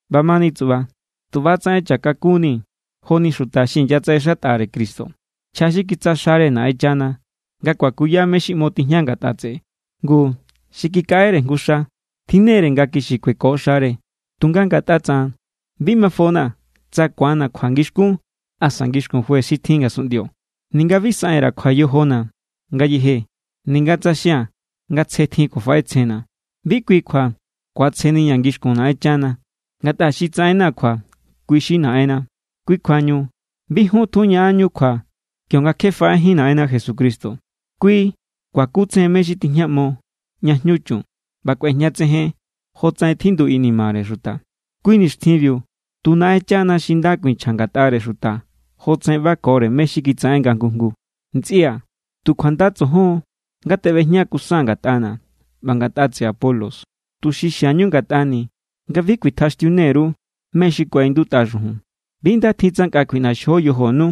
ꞌBamani tsuꞌba, tu ꞌba=tsaꞌen cha kakunnii̱ joni xuta xi inyatsaꞌexatꞌare Cristo, nchja xi kitsja xare Naꞌenchana nga kuakuya mé= xi ꞌmo tijña ngatꞌa tseꞌe. Ngu, xi kikaꞌere jngu xa, tjinnere nga kixi kueko xare. Tunga ngatꞌa tsaꞌan, bi mafona̱ tsa ku̱anna̱ kjua ngixkún asa ngixkun juez xi tjin ngasunꞌndio. Ninga bi saꞌen_ra̱ kjua yojona̱ ngayeje. Ninga tsa xia̱n nga tsje tjin kjuafaꞌetsjenna̱, bi kui kjua ku̱atsjeniña̱ ngixkun Naꞌenchana. Ngatꞌa xi tsaꞌenna̱ kjua, kui= xi Naꞌenna. Kui kjuañu bi jun tjun ñaꞌanñu kjua kionga kje faꞌejín Naꞌenna Jesucristo. Kui kuakutsejen mé= xi tijñaꞌmo ña jñu chun, ꞌba kꞌuejñatsejen jotsaꞌen tjindu inimare xuta. Kui nixtjinbiu tu Naꞌenchana xi nda kuinchja ngatꞌare xuta jotsaꞌen ꞌbakore mé= xi kitsaꞌen nga jngu jngu. Ntsꞌia̱, tu kjuanda tsojon= nga teꞌbejña kusaa̱n ngatꞌana̱ ꞌba ngatꞌa tseꞌe Apolos, tuxi xiañu ngatꞌani̱ nga bi kuitjaxtiune_ru mé= xi kuaꞌindutꞌa xujun. Bi nda tjin tsa nkꞌa kjuiꞌnaxjo yojonu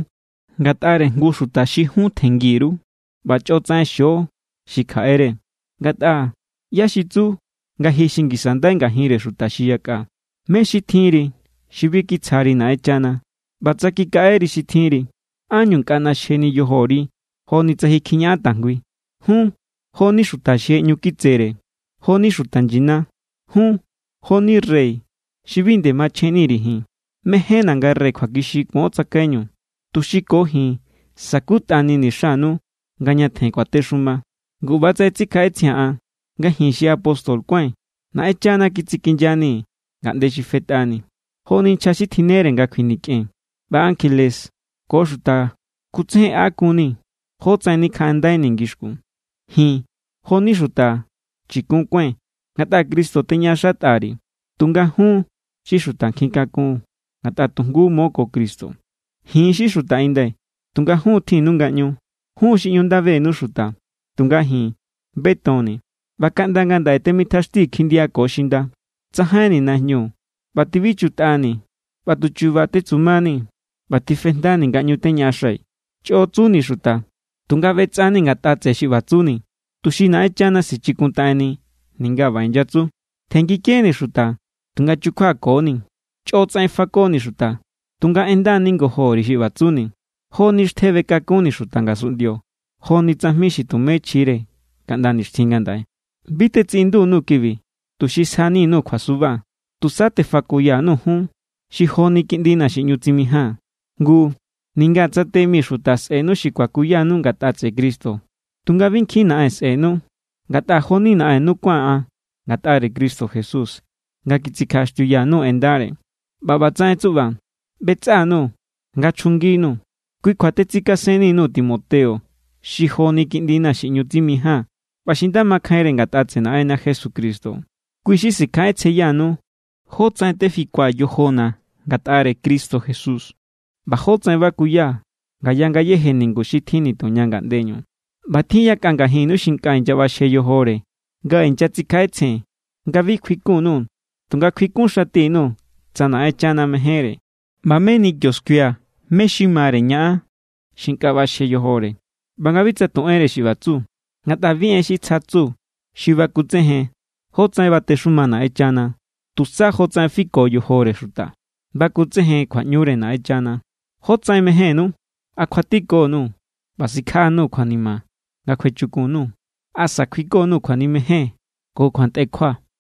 ngatꞌare jngu xuta xi jun tjenngi_ru ꞌba chꞌo tsaꞌen xio xi kjaꞌere. Ngatꞌa, ¿ꞌyá xi tsu nga ji xi ngisa ndai ngajinre xuta xi yakꞌa? ¿Mé= xi tjinri xi bi kitsjari Naꞌenchana? ꞌBa tsa kikaꞌeri xi tjinri, ¿ánñu nkꞌa ꞌnaxjeni yojori joni tsa ji kjiñaꞌan tajngui? Jun jo=ni xuta xi je ꞌñu kitsere, jo=ni xuta nyina. Jun jo=ni rey xi bi nde machjenni_ri̱ ji̱n. Mejénna̱ nga rey kjuakixi kuon tsakaiñu, tuxi ko ji̱n sa̱kutꞌanini̱ xanu nga ñatjen kuatexuma. Ngu ꞌbatsaꞌen tsikjaꞌetsjia̱n an nga ji̱n xi apóstol kuái̱n, Naꞌenchana kitsikinyanii̱ ngaꞌnde xi fetꞌani, joni nchja xi tjinnere nga kjuinikꞌen. ꞌBa ankjele ko xuta kutsejenꞌakunni jótsaꞌen nikjaꞌandaini̱ ngixkun. Ji̱n jo=ni xuta chikun kuái̱n ngatꞌa Cristo teñaꞌaxatꞌa_ri̱, tunga jun= xi xuta nkjin kakun ngatꞌa tu jngu mo ko Cristo. Ji̱n= xi xuta inda, tunga jun tjinnu ngaꞌñu. Jun= xi ꞌñu nda benu xuta, tunga ji̱n betonni̱. ꞌBa kaꞌnda ngandaꞌe temitjaxtii̱ kjindia ko xinda. Tsajainni̱ najñu ꞌba tibichutꞌani̱ ꞌba tu chu̱ba̱ tetsumasun=nii̱. ꞌBa tifejndani̱ nga ꞌñu teñaꞌaxai̱. Chꞌo tsuni̱ xuta, tunga ꞌbetsꞌa=ni̱ ngatꞌa tseꞌe xi ꞌba tsuni̱, tuxi Naꞌenchana sichikuntaꞌenni ninga ꞌba inyatsu. Tjenngikeni̱ xuta, tunga chukjuako=ni̱. Chꞌo tsaꞌen fakoni̱ xuta, tunga en nda ningojo_ri̱ xi ꞌba tsuni̱. Jo=ni xtje bekakunni̱ xuta ngasunꞌndio, joni tsajmi xi tumé chjire kaꞌnda nixtjin ngandaꞌe. Bi tetsiꞌindu_nuu̱ kibi, tuxi sjani_nuu̱ kjuasuba. Tusa tefakoya_nuu̱ jun xi joni kiꞌndina̱ xi ꞌñu tsimijaa̱n. Ngu, ninga tsa te mi xuta sꞌe̱nu xi kuakuyanu ngatꞌa tseꞌe Cristo, tunga bi nkjin naꞌen sꞌe̱nu. Ngatꞌa jo=ni naꞌennu kuáa̱n an ngatꞌare Cristo Jesús nga kitsikjaꞌaxtiuya_nuu̱ en ndare. ꞌBa ꞌbatsaꞌen tsuꞌba, ꞌbetsꞌa_nuu̱ nga chjunginuu̱. Kui kjua tetsikasenni_nuu̱ Timoteo, xi jo=ni kiꞌndina̱ xi ꞌñu tsimijaa̱n ꞌba xi nda makjainre ngatꞌa tseꞌe Naꞌenna Jesucristo. Kui= xi sikjaꞌetsjenyanu jótsaꞌen tefikua̱ yojona̱ ngatꞌare Cristo Jesús, ꞌba jótsaꞌen bakuya ngaya ngayéje ningu xi tjin tuña ngaꞌndeñu. ꞌBa tjin yakꞌa ngajinnu xi nkꞌa inyaꞌbaxje yojore nga inyatsikjaꞌetsjen nga bi kjuikun_nuu̱. Tunga kjuikun xati_nuu̱ tsa Naꞌenchana mejénre, ꞌba meni kio skuia̱ mé= xi mare ñaꞌan xi nkꞌa ꞌbaxje yojore, ꞌba nga bi tsa tu enre xi ꞌba tsu. Ngatꞌa bi en xi tsja tsu xi bakutsejen jotsaꞌen batexuma Naꞌenchana, tusa jotsaꞌen fiko yojore xuta bakutsejen kjuaꞌñure Naꞌenchana. ¿Jótsaꞌen mejénnú? ¿A kjuatiko_nuu̱ ꞌba sikjaꞌa_nuu̱ kjuanima nga kjuechukun_nuu̱? ¿Asa kjuiko_nuu̱ kjuanimejen ko kjuantꞌekjua?